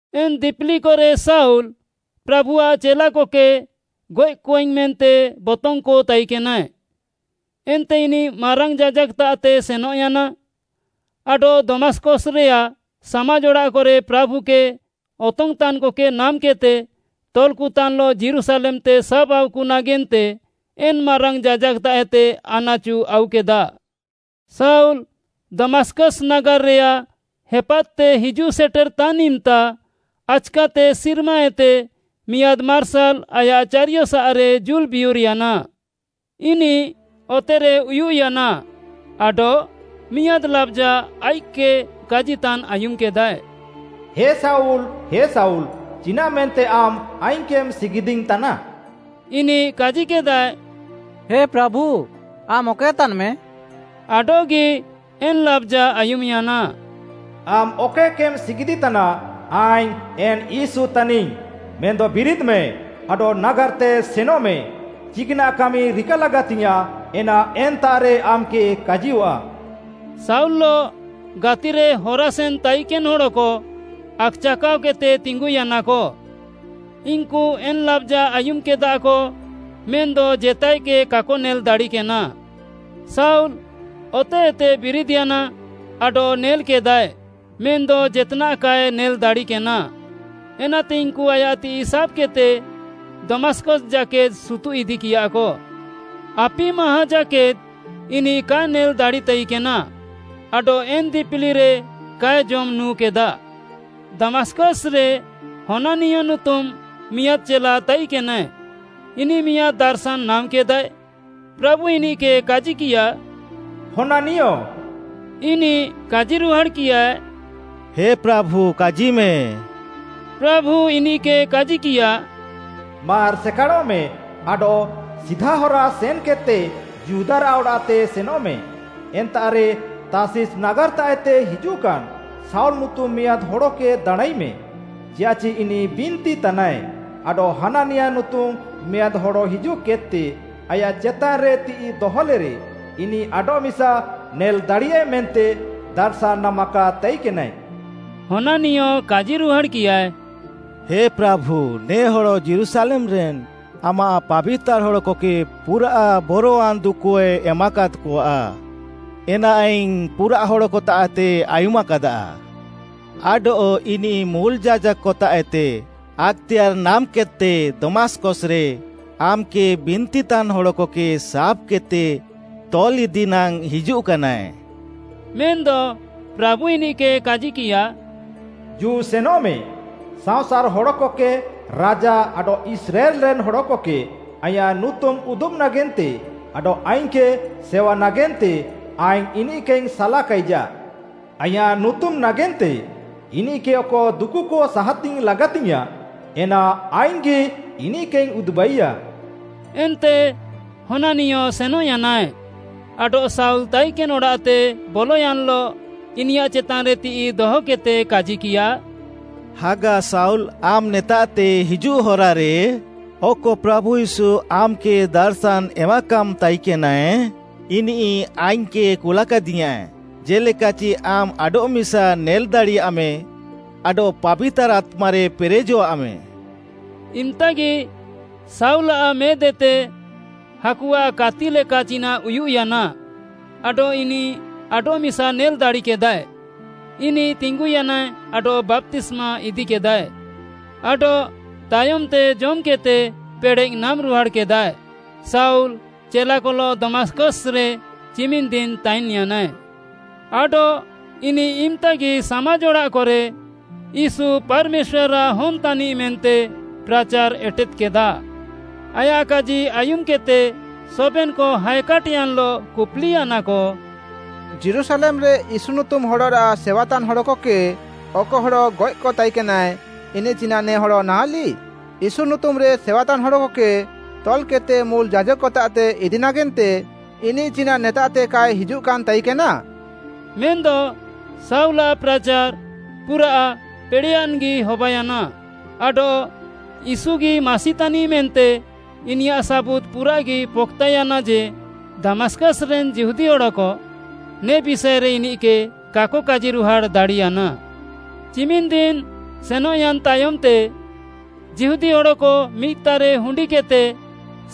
ଏନ୍‌ ଦିପିଲିକରେ ଶାଉଲ୍‌, ପ୍ରାଭୁଆଃ ଚେଲାକକେ ଗଏଃକଆଇଙ୍ଗ୍‌ ମେନ୍ତେ ବତଙ୍ଗ୍‌କ ତାଇକେନାଏ। ଏନ୍ତେ ଇନିଃ ମାରାଙ୍ଗ୍‌ ଯାଜାକ୍‌ତାଃତେ ସେନଃୟାନା, ଆଡଃ ଦମାସ୍‌କସ୍‌ରେୟାଃ ସାମାଜ୍‌ ଅଡ଼ାଃକରେ ପ୍ରାଭୁକେ ଅତଙ୍ଗ୍‌ତାନ୍‌କକେ ନାମ୍‌କେଦ୍‌ତେ ତଲ୍‌କତାନ୍‌ଲଃ ଯୀରୁଶାଲେମ୍‌ତେ ସାବ୍‌ଆଉକ ନାଗେନ୍ତେ ଏନ୍‌ ମାରାଙ୍ଗ୍‌ ଯାଜାକ୍‌ତାଃଏତେ ଆନାଚୁ ଆଉକେଦା। ଶାଉଲ୍‌ ଦମାସ୍‌କସ୍‌ ନାଗାର୍‌ରେୟାଃ ହେପାଦ୍‌ତେ ହିଜୁଃ ସେଟେରଃତାନ୍‌ ଇମ୍‌ତା, ଆଚ୍‌କାତେ ସିର୍ମାଏତେ ମିଆଁଦ୍‌ ମାର୍ସାଲ୍‌ ଆୟାଃ ଚାରିୟସାଃରେ ଜୁଲ୍‌ ବିୟୁର୍‌ୟାନା। ଇନିଃ ଅତେରେ ଉୟୁଃୟାନା ଆଡଃ ମିଆଁଦ୍‌ ଲାବ୍‌ଜା ଆଇଃକ୍‌କେ କାଜିତାନ୍‌ ଆୟୁମ୍‌କେଦାଏ, “ହେ ଶାଉଲ୍, ହେ ଶାଉଲ୍‌, ଚିନାଃମେନ୍ତେ ଆମ୍‌ ଆଇଙ୍ଗ୍‌କେମ୍‌ ସିଗିଦିଇଙ୍ଗ୍‌ତାନା?” ଇନିଃ କାଜିକେଦାଏ, “ହେ ପ୍ରାଭୁ, ଆମ୍‌ ଅକଏ ତାନ୍‌ମେ?” ଆଡଃଗି ଏନ୍‌ ଲାବ୍‌ଜା ଆୟୁମ୍‌ୟାନା, “ଆମ୍‌ ଅକଏକେମ୍‌ ସିଗିଦିତାନା, ଆଇଙ୍ଗ୍‌ ଏନ୍‌ ୟୀଶୁ ତାନିଙ୍ଗ୍‌। ମେନ୍‌ଦ ବିରିଦ୍‌ମେ, ଆଡଃ ନାଗାର୍‌ତେ ସେନଃମେ, ଚିକ୍‌ନାଃ କାମି ରିକା ଲାଗାତିଙ୍ଗ୍‌ୟାଁଃ, ଏନା ଏନ୍ତାଃରେ ଆମ୍‌କେ କାଜିୟଃଆ।” ଶାଉଲ୍‌ଲଃ ଗାତିରେ ହରାସେନ୍‌ ତାଇକେନ୍‌ ହଡ଼କ ଆକ୍‌ଚାକାଅକେଦ୍‌ତେ ତିଙ୍ଗୁୟାନାକ, ଇନ୍‌କୁ ଏନ୍‌ ଲାବ୍‌ଜା ଆୟୁମ୍‌କେଦାକ ମେନ୍‌ଦ ଜେତାଏକେ କାକ ନେଲ୍‌ ଦାଡ଼ିକେନା। ଶାଉଲ୍‌ ଅତେହେତେ ବିରିଦ୍‍ୟାନା ଆଡଃ ନେଲ୍‌କେଦାଏ ମେନ୍‌ଦ ଜେତ୍‌ନାଃ କାଏ ନେଲ୍‌ ଦାଡ଼ିକେନା। ଏନାତେ ଇନ୍‌କୁ ଆୟାଃ ତିଃଇ ସାବ୍‌କେଦ୍‌ତେ ଦମାସ୍‌କସ୍‌ ଜାକେଦ୍‌ ସୁତୁଃ ଇଦିକିୟାକ। ଆପି ମାହାଁ ଜାକେଦ୍‌ ଇନିଃ କାଏ ନେଲ୍‌ ଦାଡ଼ିତାଇକେନା ଆଡଃ ଏନ୍‌ ଦିପିଲିରେ କାଏ ଜମ୍‍ ନୁଁକେଦା। ଦମାସ୍‌କସ୍‌ରେ ହନାନିୟ ନୁତୁମ୍‌ ମିଆଁଦ୍‌ ଚେଲା ତାଇକେନାଏ। ଇନିଃ ମିଆଁଦ୍‌ ଦାର୍‌ଶାନ୍‌ ନାମ୍‌କେଦାଏ, ପ୍ରାଭୁ ଇନିଃକେ କାଜିକିୟା, “ହନାନିୟ!” ଇନିଃ କାଜିରୁହାଡ଼୍‌କିୟାଏ, “ହେ ପ୍ରାଭୁ କାଜିମେ।” ପ୍ରାଭୁ ଇନିଃକେ କାଜିକିୟା, “ମାର୍‌ ସେକାଡ଼ଃମେ ଆଡଃ ସିଧା ହରା ସେନ୍‌କେଦ୍‌ତେ ଯିହୁଦାରାଃ ଅଡ଼ାଃତେ ସେନଃମେ। ଏନ୍ତାଃରେ ତାର୍ଷିସ୍‌ ନାଗାର୍‌ତାଃଏତେ ହିଜୁଃକାନ୍‌ ଶାଉଲ୍‌ ନୁତୁମ୍‌ ମିଆଁଦ୍‌ ହଡ଼କେ ଦାଣାଁଁଇମେ, ଚିଆଃଚି ଇନିଃ ବିନ୍ତିତାନାଏ, ଆଡଃ ହନାନିୟ ନୁତୁମ୍‌ ମିଆଁଦ୍‌ ହଡ଼ ହିଜୁଃକେଦ୍‌ତେ ଆୟାଃ ଚେତାନ୍‌ରେ ତିଃଇ ଦହଲେରେ ଇନିଃ ଆଡଃମିସା ନେଲ୍‌ ଦାଡ଼ିୟାଏ ମେନ୍ତେ ଦାର୍‌ଶାନ୍‌ ନାମାକାଦ୍‌ ତାଇକେନାଏ।” ହନାନିୟ କାଜିରୁହାଡ଼୍‌କିୟାଏ, “ହେ ପ୍ରାଭୁ, ନେ ହଡ଼ ଯୀରୁଶାଲେମ୍‌ରେନ୍‌ ଆମାଃ ପାବିତାର୍‌ ହଡ଼କକେ ପୁରାଃ ବରୱାନ୍‌ ଦୁକୁକଏ ଏମାକାଦ୍‌କଆ, ଏନା ଆଇଙ୍ଗ୍‌ ପୁରାଃ ହଡ଼କତାଃଏତେଇଙ୍ଗ୍‌ ଆୟୁମାକାଦା। ଆଡଃ ଇନିଃ ମୁଲ୍‌ ଯାଜାକ୍‌କତାଃଏତେ ଆକ୍‌ତେୟାର୍‌ ନାମ୍‌କେଦ୍‌ତେ ଦମାସ୍‌କସ୍‌ରେ ଆମ୍‌କେ ବିନ୍ତିତାନ୍‌ ହଡ଼କକେ ସାବ୍‌କେଦ୍‌ତେ ତଲ୍‌ଇଦି ନାଙ୍ଗ୍‌ ହିଜୁଃକାନାଏ।” ମେନ୍‌ଦ ପ୍ରାଭୁ ଇନିଃକେ କାଜିକିୟା, “ଜୁ ସେନଃମେ, ସାଅଁସାର୍‌ ହଡ଼କକେ, ରାଜା ଆଡଃ ଇସ୍ରାଏଲ୍‌ରେନ୍‌ ହଡ଼କକେ ଆଇଁୟାଃ ନୁତୁମ୍‌ ଉଦୁବେ ନାଗେନ୍ତେ ଆଡଃ ଆଇଙ୍ଗ୍‌କେ ସେୱା ନାଗେନ୍ତେ ଆଇଙ୍ଗ୍‌ ଇନିଃକେଇଙ୍ଗ୍‌ ସାଲାକାଇଜା। ଆଇଁୟାଃ ନୁତୁମ୍‌ ନାଗେନ୍ତେ ଇନିଃକେ ଅକ ଦୁକୁକ ସାହାତିଙ୍ଗ୍‌ ଲାଗାତିଙ୍ଗ୍‌ୟାଁଃ, ଏନା ଆଇଙ୍ଗ୍‌ଗି ଇନିଃକେଇଙ୍ଗ୍‌ ଉଦୁବାଇୟା।” ଏନ୍ତେ ହନାନିୟ ସେନଃୟାନାଏ ଆଡଃ ଶାଉଲ୍‌ ତାଇକେନ୍‌ ଅଡ଼ାଃତେ ବଲୟାନ୍‌ଲଃ ଇନିୟାଃ ଚେତାନ୍‌ରେ ତିଃଇ ଦହକେଦ୍‌ତେ କାଜିକିୟା, “ହାଗା ଶାଉଲ୍‌, ଆମ୍‌ ନେତାଃତେ ହିଜୁଃ ହରାରେ, ଅକ ପ୍ରାଭୁ ୟୀଶୁ ଆମ୍‌କେ ଦାର୍‌ଶାନ୍‌ ଏମାକାମ୍‌ ତାଇକେନାଏ, ଇନିଃ ଆଇଙ୍ଗ୍‌କେ କୁଲାକାଦିୟାଁ, ଜେ'ଲେକାଚି ଆମ୍‌ ଆଡଃମିସା ନେଲ୍‌ ଦାଡ଼ିୟାମ୍‌ ଆଡଃ ପାବିତାର୍‌ ଆତ୍ମାରେ ପେରେଜଃଆମ୍‌।” ଇମ୍‍ତାଗି ଶାଉଲ୍‌ଆଃ ମେଦ୍‍ହେତେ, ହାକୁଆଃ କାତି ଲେକା ଚିନାଃ ଉୟୁଃୟାନା ଆଡଃ ଇନିଃ ଆଡଃମିସା ନେଲ୍‍ ଦାଡ଼ିକେଦାଏ। ଇନିଃ ତିଙ୍ଗୁୟାନାଏ ଆଡଃ ବାପ୍ତିସ୍ମା ଇଦିକେଦାଏ। ଆଡଃ ତାୟମ୍‌ତେ ଜମ୍‌କେଦ୍‌ତେ ପେଡ଼େଃ ନାମ୍‌ରୁହାଡ଼୍‌କେଦାଏ। ଶାଉଲ୍ ଚେଲାକଲଃ ଦମାସ୍‌କସ୍‌ରେ ଚିମିନ୍‌ ଦିନ୍‌ ତାଇନ୍‌ୟାନାଏ। ଆଡଃ ଇନିଃ ଇମ୍‌ତାଗି ସାମାଜ୍‌ ଅଡ଼ାଃକରେ, ୟୀଶୁ ପାର୍‌ମେଶ୍ୱାର୍‌ଆଃ ହନ୍‌ତାନିଃ ମେନ୍ତେ ପ୍ରାଚାର୍‌ ଏଟେଦ୍‌କେଦା। ଆୟାଃ କାଜି ଆୟୁମ୍‌କେଦ୍‌ତେ ସବେନ୍‌କ ହାଏକାଟ୍‍ୟାନ୍‌ଲଃ କୁପ୍‌ଲିୟାନାକ, “ଯୀରୁଶାଲେମ୍‌ରେ ୟୀଶୁ ନୁତୁମ୍‌ ହଡ଼ରାଃ ସେୱାତାନ୍‌ ହଡ଼କକେ ଅକ ହଡ଼ ଗଏଃକ ତାଇକେନାଏ, ଇନିଃ ଚିନାଃ ନେ ହଡ଼ ନାହାଁଲିଃ? ୟୀଶୁ ନୁତୁମ୍‌ରେ ସେୱାତାନ୍‌ ହଡ଼କକେ ତଲ୍‌କେଦ୍‌ତେ ମୁଲ୍‌ ଯାଜାକ୍‌କତାଃତେ ଇଦି ନାଗେନ୍ତେ ଇନିଃ ଚିନାଃ ନେତାଃତେ କାଏ ହିଜୁଃକାନ୍‌ ତାଇକେନା?” ମେନ୍‌ଦ ଶାଉଲ୍‌ଆଃ ପ୍ରାଚାର୍‌ ପୁରାଃ ପେଡ଼େୟାନ୍‌ଗି ହବାୟାନା, ଆଡଃ ୟୀଶୁଗି ମାସିତାନିଃ ମେନ୍ତେ ଇନିୟାଃ ସାବୁତ୍‌ ପୁରାଃଗି ପକ୍‌ତାୟାନା ଯେ, ଦମାସ୍‌କସ୍‌ରେନ୍‌ ଯିହୁଦୀ ହଡ଼କ ନେ ବିଷାଏରେ ଇନିଃକେ କାକ କାଜିରୁହାଡ଼୍‌ ଦାଡ଼ିୟାନା। ଚିମିନ୍‌ ଦିନ୍ ସେନଃୟାନ୍‍ ତାୟମ୍‌ତେ, ଯିହୁଦୀ ହଡ଼କ ମିଦ୍‌ତାଃରେ ହୁଣ୍ଡିକେଦ୍‌ତେ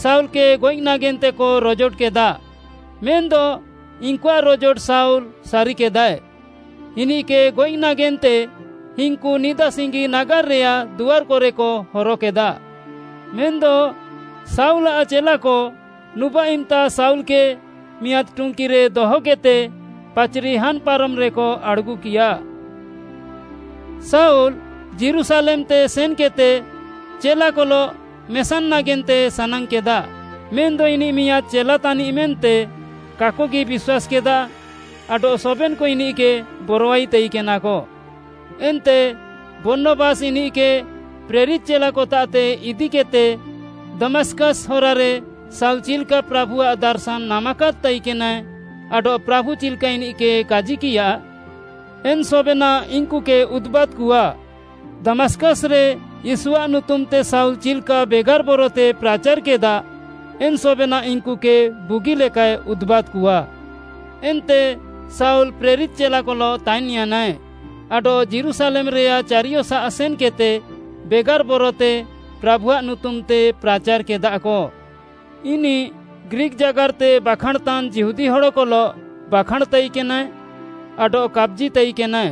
ଶାଉଲ୍‌କେ ଗଏଃ ନାଗେନ୍ତେକ ରୋଜୋଟକେଦା, ମେନ୍‌ଦ ଇନ୍‌କୁଆଃ ରୋଜୋଟ ଶାଉଲ୍‌ ସାରିକେଦାଏ। ଇନିଃକେ ଗଏଃ ନାଗେନ୍ତେ ଇନ୍‌କୁ ନିଦା ସିଙ୍ଗି ନାଗାର୍‌ରେୟାଃ ଦୁଆର୍‌କରେକ ହରକେଦା। ମେନ୍‌ଦ ଶାଉଲ୍‌ଆଃ ଚେଲାକ ନୁବାଃ ଇମ୍‌ତା ଶାଉଲ୍‌କେ ମିଆଁଦ୍‌ ଟୁଙ୍କିରେ ଦହକେଦ୍‌ତେ ପାଚ୍‌ରି ହାନ୍‌ପାରମ୍‌ରେକ ଆଡ଼୍‌ଗୁକିୟା। ଶାଉଲ୍‌ ଯୀରୁଶାଲେମ୍‌ତେ ସେନ୍‌କେଦ୍‌ତେ ଚେଲାକଲଃ ମେସାନ୍‌ ନାଗେନ୍ତେ ସାନାଙ୍ଗ୍‌କେଦା। ମେନ୍‌ଦ ଇନିଃ ମିଆଁଦ୍‌ ଚେଲା ତାନିଃ ମେନ୍ତେ କାକଗି ବିଶ୍ୱାସ୍‌କେଦା ଆଡଃ ସବେନ୍‌କ ଇନିଃକେ ବରଆଇ ତାଇକେନାକ। ଏନ୍ତେ ବର୍ଣ୍ଣବାସ୍‌ ଇନିଃକେ ପ୍ରେରିତ୍‌ ଚେଲାକତାଃତେ ଇଦିକେଦ୍‌ତେ ଦମାସ୍‌କସ୍‌ ହରାରେ ଶାଉଲ୍‌ ଚିଲ୍‌କା ପ୍ରାଭୁଆଃ ଦାର୍‌ଶାନ୍‌ ନାମାକାଦ୍‌ ତାଇକେନାଏ ଆଡଃ ପ୍ରାଭୁ ଚିଲ୍‌କା ଇନିଃକେ କାଜିକିୟା, ଏନ୍‌ ସବେନାଃ ଇନ୍‌କୁକେ ଉଦୁବାଦ୍‌କଆ। ଦମାସ୍‌କସ୍‌ରେ ୟୀଶୁଆଃ ନୁତୁମ୍‌ତେ ଶାଉଲ୍‌ ଚିଲ୍‌କା ବେଗାର୍‌ ବରତେ ପ୍ରାଚାର୍‌କେଦା, ଏନ୍‌ ସବେନାଃ ଇନ୍‌କୁକେ ବୁଗିଲେକାଏ ଉଦୁବାଦ୍‌କଆ। ଏନ୍ତେ ଶାଉଲ୍‌ ପ୍ରେରିତ୍‌ ଚେଲାକଲଃ ତାଇନ୍‌ୟାନାଏ ଆଡଃ ଯୀରୁଶାଲେମ୍‌ରେୟାଃ ଚାରିୟସାଃ ସେନ୍‌କେଦ୍‌ତେ ବେଗାର୍‌ ବରତେ ପ୍ରାଭୁଆଃ ନୁତୁମ୍‌ତେ ପ୍ରାଚାର୍‌କେଦାକ। ଇନିଃ ଗ୍ରୀକ୍‌ ଜାଗାର୍‌ତେ ବାଖାଁଣ୍‌ତାନ୍‌ ଯିହୁଦୀ ହଡ଼କଲଃ ବାଖାଁଣ୍‌ ତାଇକେନାଏ ଆଡଃ କାପ୍‌ଜିତାଇକେନାଏ,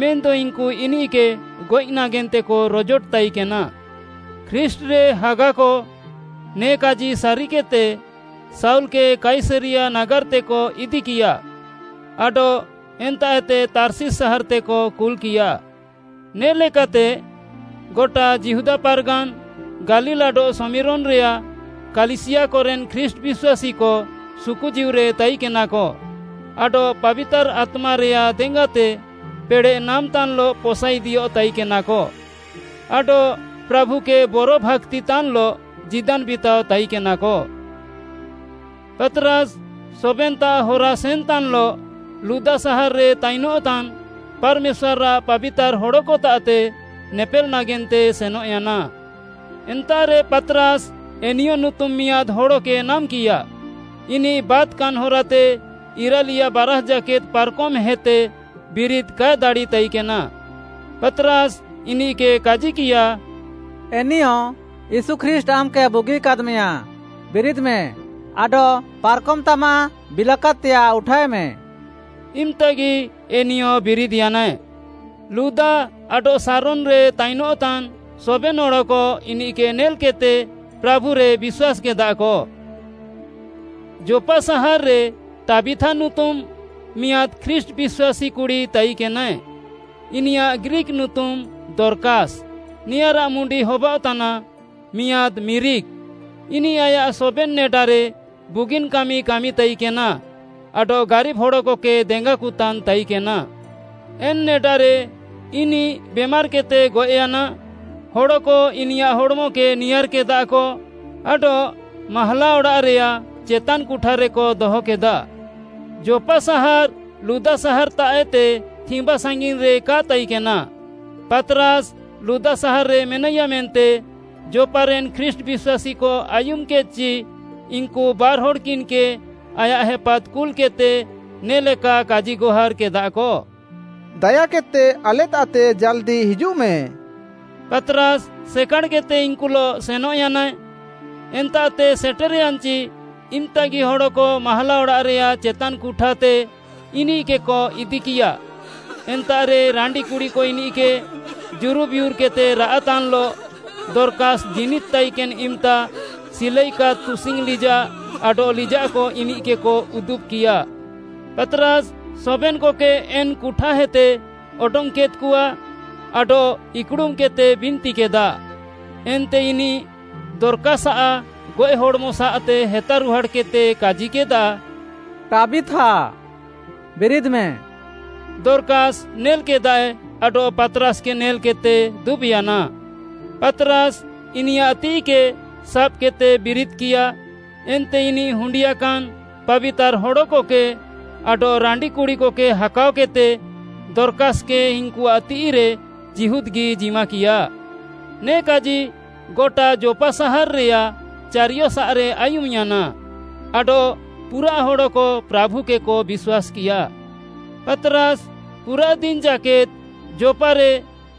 ମେନ୍‌ଦ ଇନ୍‌କୁ ଇନିଃକେ ଗଏଃ ନାଗେନ୍ତେକ ରୋଜୋଟ ତାଇକେନା। ଖ୍ରୀଷ୍ଟ୍‌ରେ ହାଗାକ ନେ କାଜି ସାରିକେଦ୍‌ତେ, ଶାଉଲ୍‌କେ କାଇସରିୟା ନାଗାର୍‌ତେକ ଇଦିକିୟା ଆଡଃ ଏନ୍ତାଃଏତେ ତାର୍ଷିସ୍‌ ସାହାର୍‌ତେକ କୁଲ୍‌କିୟା। ନେ'ଲେକାତେ ଗଟା ଯିହୁଦା ପାର୍‌ଗାନ୍‌, ଗାଲିଲ୍‌ ଆଡଃ ଶମିରୋନ୍‌ରେୟାଃ କାଲିସିୟାକରେନ୍‌ ଖ୍ରୀଷ୍ଟ୍‌ ବିଶ୍ୱାସୀକ ସୁକୁଜୀଉରେ ତାଇକେନାକ ଆଡଃ ପାବିତାର୍‌ ଆତ୍ମାରେୟାଃ ଦେଙ୍ଗାତେ ପେଡ଼େଃ ନାମ୍‌ତାନ୍‌ଲଃ ପସାଇଦିୟଃ ତାଇକେନାକ ଆଡଃ ପ୍ରାଭୁକେ ବରଭାକ୍ତିତାନ୍‌ଲଃ ଜୀଦାନ୍‌ ବିତାଅ ତାଇକେନାକ। ପାତ୍‌ରାସ୍‌ ସବେନ୍‍ତାଃ ହରାସେନ୍‌ତାନ୍‌ଲଃ ଲୁଦା ସାହାର୍‌ରେ ତାଇନଃତାନ୍‌ ପାର୍‌ମେଶ୍ୱାର୍‌ଆଃ ପାବିତାର୍‌ ହଡ଼କତାଃତେ ନେପେଲ୍‌ ନାଗେନ୍ତେ ସେନଃୟାନା। ଏନ୍ତାଃରେ ପାତ୍‌ରାସ୍‌ ଏନିୟ ନୁତୁମ୍‌ ମିଆଁଦ୍‌ ହଡ଼କେ ନାମ୍‍କିୟା। ଇନିଃ ବାତ୍‌କାନ୍‌ ହରାତେ ଇରାଲିୟା ବାରାଷ୍‌ ଜାକେଦ୍‌ ପାର୍‌କମ୍‌ହେତେ ବିରିଦ୍‌ କାଏ ଦାଡ଼ିତାଇକେନା। ପାତ୍‌ରାସ୍‌ ଇନିଃକେ କାଜିକିୟା, “ଏନିୟ, ୟୀଶୁ ଖ୍ରୀଷ୍ଟ୍‌ ଆମ୍‌କେ ବୁଗିକାଦ୍‌ମେଆ। ବିରିଦ୍‌ମେ ଆଡଃ ପାର୍‌କମ୍‌ତାମାଃ ବିଲାକାଦ୍‌ତେୟାଃ ଉଠାଏମେ।” ଇମ୍‌ତାଗି ଏନିୟ ବିରିଦ୍‌ୟାନାଏ। ଲୁଦା ଆଡଃ ଶାରୋନ୍‌ରେ ତାଇନଃତାନ୍‌ ସବେନ୍‌ ହଡ଼କ ଇନିଃକେ ନେଲ୍‌କେଦ୍‌ତେ ପ୍ରାଭୁରେ ବିଶ୍ୱାସ୍‌କେଦାକ। ଯୋପ୍‌ପା ସାହାର୍‌ରେ ଟାବିଥା ନୁତୁମ୍‌ ମିଆଁଦ୍‌ ଖ୍ରୀଷ୍ଟ୍‌ ବିଶ୍ୱାସୀ କୁଡ଼ି ତାଇକେନାଏ। ଇନିୟାଃ ଗ୍ରୀକ୍‌ ନୁତୁମ୍‌ ଦର୍କାସ୍‌, ନେଆଁରାଃ ମୁଣ୍ଡି ହବାଅଃତାନା “ମିଆଁଦ୍‌ ମିରିକ୍‌।” ଇନିଃ ଆୟାଃ ସବେନ୍‌ ନେଡାରେ ବୁଗିନ୍‌ କାମି କାମିତାଇକେନା ଆଡଃ ଗାରିବ୍‌ ହଡ଼କକେ ଦେଙ୍ଗାକତାନ୍‌ ତାଇକେନା। ଏନ୍‌ ନେଡାରେ ଇନିଃ ବେମାର୍‌କେଦ୍‌ତେ ଗଏଃୟାନା। ହଡ଼କ ଇନିୟାଃ ହଡ଼୍‌ମକେ ନିୟାଁର୍‌କେଦାକ ଆଡଃ ମାହାଲା ଅଡ଼ାଃରେୟାଃ ଚେତାନ୍‌ କୁଠାରେକ ଦହକେଦା। ଯୋପ୍‌ପା ସାହାର୍‌ ଲୁଦା ସାହାର୍‌ତାଃଏତେ ଥିମ୍ବା ସାଙ୍ଗିନ୍‌ରେ କା ତାଇକେନା। ପାତ୍‌ରାସ୍‌ ଲୁଦା ସାହାର୍‌ରେ ମେନାଇୟା ମେନ୍ତେ ଯୋପ୍‌ପାରେନ୍‌ ଖ୍ରୀଷ୍ଟ୍‌ ବିଶ୍ୱାସୀକ ଆୟୁମ୍‌କେଦ୍‌ଚି, ଇନ୍‌କୁ ବାର୍‌ହଡ଼୍‌କିନ୍‌କେ ଆୟାଃ ହେପାଦ୍‌ କୁଲ୍‌କେଦ୍‌ତେ ନେ'ଲେକା କାଜିଗହାର୍‌କେଦାକ, “ଦାୟାକେଦ୍‌ତେ ଆଲେତାଃତେ ଜାଲ୍‌ଦି ହିଜୁଃମେ।” ପାତ୍‌ରାସ୍‌ ସେକାଡ଼୍‌କେଦ୍‌ତେ ଇନ୍‌କୁଲଃ ସେନଃୟାନାଏ। ଏନ୍ତାଃତେ ସେଟେର୍‌ୟାନ୍‌ଚି ଇମ୍‌ତାଗି ହଡ଼କ ମାହାଲା ଅଡ଼ାଃରେୟାଃ ଚେତାନ୍‌ କୁଠାତେ ଇନିଃକେକ ଇଦିକିୟା। ଏନ୍ତାଃରେ ରାଣ୍ଡିକୁଡ଼ିକ ଇନିଃକେ ଜୁରୁବିୟୁର୍‌କେଦ୍‌ତେ ରାଆଃତାନ୍‌ଲଃ ଦର୍କାସ୍‌ ଜୀନିଦ୍‌ ତାଇକେନ୍‌ ଇମ୍‌ତା ସିଲାଇକାଦ୍‌ ତୁସିଙ୍ଗ୍‌ ଲିଜାଃ ଆଡଃ ଲିଜାଃକ ଇନିଃକେକ ଉଦୁବ୍‌କିୟା। ପାତ୍‌ରାସ୍‌ ସବେନ୍‌କକେ ଏନ୍‌ କୁଠାଏତେ ଅଡଙ୍ଗ୍‌କେଦ୍‌କଆ ଆଡଃ ଇକ୍‌ଡ଼ୁମ୍‌କେଦ୍‌ତେ ବିନ୍ତିକେଦା, ଏନ୍ତେ ଇନିଃ ଦର୍କାସ୍‌ଆଃ ଗଏଃ ହଡ଼୍‌ମସାଃତେ ହେତାରୁହାଡ଼୍‌କେଦ୍‌ତେ କାଜିକେଦା, “ଟାବିଥା, ବିରିଦ୍‌ମେ।” ଦର୍କାସ୍‌ ନେଲ୍‌କେଦାଏ ଆଡଃ ପାତ୍‌ରାସ୍‌କେ ନେଲ୍‌କେଦ୍‌ତେ ଦୁବ୍‌ୟାନା। ପାତ୍‌ରାସ୍‌ ଇନିୟାଃ ତିଃଇକେ ସାବ୍‌କେଦ୍‌ତେ ବିରିଦ୍‌କିୟା। ଏନ୍ତେ ଇନିଃ ହୁଣ୍ଡିୟାକାନ୍‌ ପାବିତାର୍‌ ହଡ଼କକେ ଆଡଃ ରାଣ୍ଡିକୁଡ଼ିକକେ ହାକାଅକେଦ୍‌ତେ ଦର୍କାସ୍‌କେ ଇନ୍‌କୁଆଃ ତିଃଇରେ ଜୀହୁଦ୍‌ଗି ଜିମାକିୟା। ନେ କାଜି ଗଟା ଯୋପ୍‌ପା ସାହାର୍‌ରେୟାଃ ଚାରିୟସାଃରେ ଆୟୁମ୍‌ୟାନା ଆଡଃ ପୁରାଃ ହଡ଼କ ପ୍ରାଭୁକେକ ବିଶ୍ୱାସ୍‌କିୟା। ପାତ୍‌ରାସ୍‌ ପୁରାଃ ଦିନ୍‌ ଜାକେଦ୍‌ ଯୋପ୍‌ପାରେ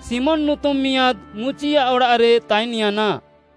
ଶିମୋନ୍‌ ନୁତୁମ୍‌ ମିଆଁଦ୍‌ ମୁଚିଆଃ ଅଡ଼ାଃରେ ତାଇନ୍‌ୟାନା।